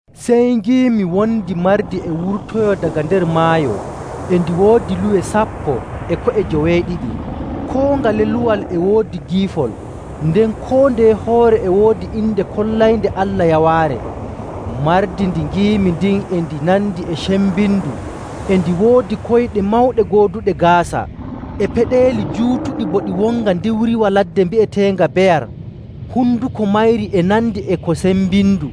Sey ngiimi wondi mardi e wurtoyoo daga nder maayo e ndi woodi luwe sappo e ko'e joweeɗiɗi. Koo ngale luwal e woodi giifol nden koo ndeye hoore e woodi inde kollaynde Allah yawaare. Mardi ndi ngiimi ndin e ndi nandi e cembindu e ndi woodi koyɗe mawɗe gooduɗe gaasa e peɗeeli juutuɗi bo ɗi wonga ndiwriwa ladde bi'eteenga beyar. Honduko mayri e nandi e ko sembindu.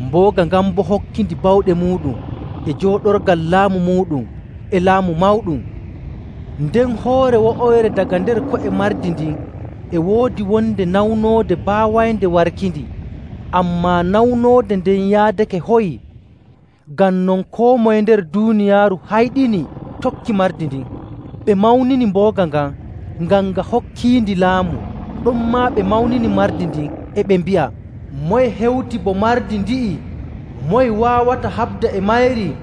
Mbooga ngan boo hokkindi bawɗe muuɗum, e jooɗorgal laamu muuɗum, e laamu mawɗum. Nden hoore wo'oyre daga nder ko'e mardi ndin e woodi wonde nawnoode baawaynde warkindi. Ammaa nawnoode nden yaadake hoyii. Ngam non koo moye nder duuniyaaru hayɗini tokki mardi ndin. Ɓe mawnini mbooga ngan, ngam nga hokkiindi laamu. Ɗonmaa ɓe mawnini mardi ndin, e ɓe mbi'a, “Moye hewti bo mardi ndi'i? Moye waawata haɓda e mayri?”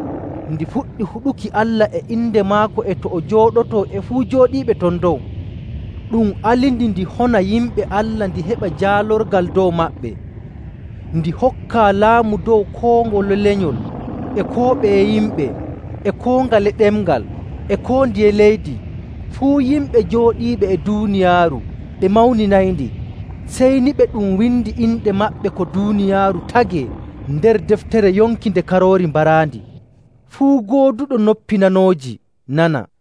Ndi fuɗɗi huɗuki Allah e inde maako e to o jooɗotoo, e fuu jooɗiiɓe ton dow. Ɗum alindi ndi hona yimɓe Allah ndi heɓa jaalorgal dow maɓɓe. Ndi hokkaa laamu dow koo ngole lenyol, e koo ɓeye yimɓe, e koo ngale ɗemngal, e koo ndiye leydi. Fuu yimɓe jooɗiiɓe e duuniyaaru ɓe mawninayndi, sey ni ɓe ɗum windi inɗe maɓɓe ko duuniyaaru tagee nder deftere yonki nde Karoori baraandi. “Fuu gooduɗo noppi nanooji nana!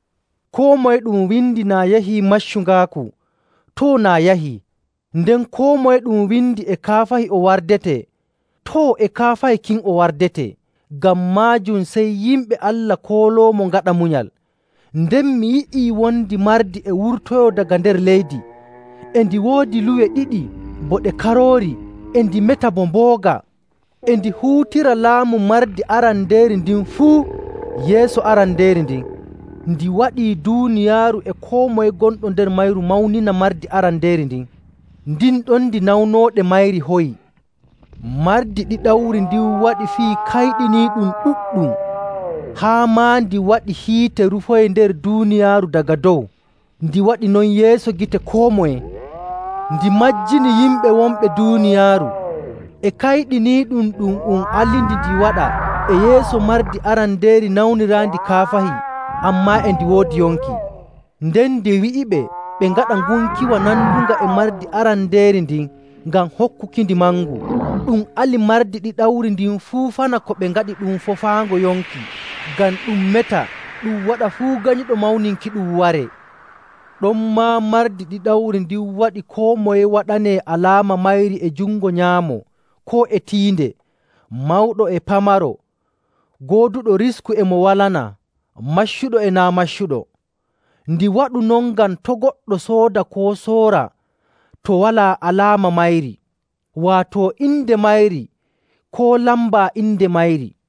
Koo moye ɗum windi naa yahii maccungaaku, too, naa yahii: nden koo moye ɗum windi e kaafahi o wardetee, too, e kaafahi kin o wardetee. Ngam maajum sey yimɓe Allah kooloomo ngaɗa munyal.” Nden mi yi'ii wondi mardi e wurtoyoo daga nder leydi. E ndi woodi luwe ɗiɗi bo ɗe karoori, e ndi meta bo mbooga. E ndi huutira laamu mardi arandeeri ndin fuu yeeso arandeeri ndin. Ndi waɗii duuniyaaru e koo moye gonɗo nder mayru mawnina mardi arandeeri ndin, ndin ɗon ndi nawnoode mayri hoyi. Mardi ɗiɗawri ndin waɗi fii kayɗiniiɗum ɗuɗɗum, haa maa ndi waɗi hiite rufoyi nder duuniyaaru daga dow. Ndi waɗi non yeeso gite koo moye. Ndi majjini yimɓe wonɓe duuniyaaru e kayɗiniiɗum ɗum um alindi ndi waɗa e yeeso mardi arandeeri nawniraandi kaafahi ammaa e ndi woodi yonki. Nden ndi wi'iɓe ɓe ngaɗa ngunkiwa nandunga e mardi arandeeri ndin ngam hokkukindi mangu. Ɗum ali mardi ɗiɗawri ndin fuufana ko ɓe ngaɗi ɗum foofaango yonki ngam ɗum meta ɗum waɗa fuu ganyuɗo mawninkiɗum waree. Ɗonmaa mardi ɗiɗawri ndin waɗi koo moye waɗanee alaama mayri e jungo nyaamo koo e tiinde, mawɗo e pamaro, gooduɗo risku e mo walanaa, maccuɗo e naa' maccuɗo. Ndi waɗu non ngam to' goɗɗo sooda koo soora to walaa alaama mayri, waato inde mayri koo lamba inde mayri.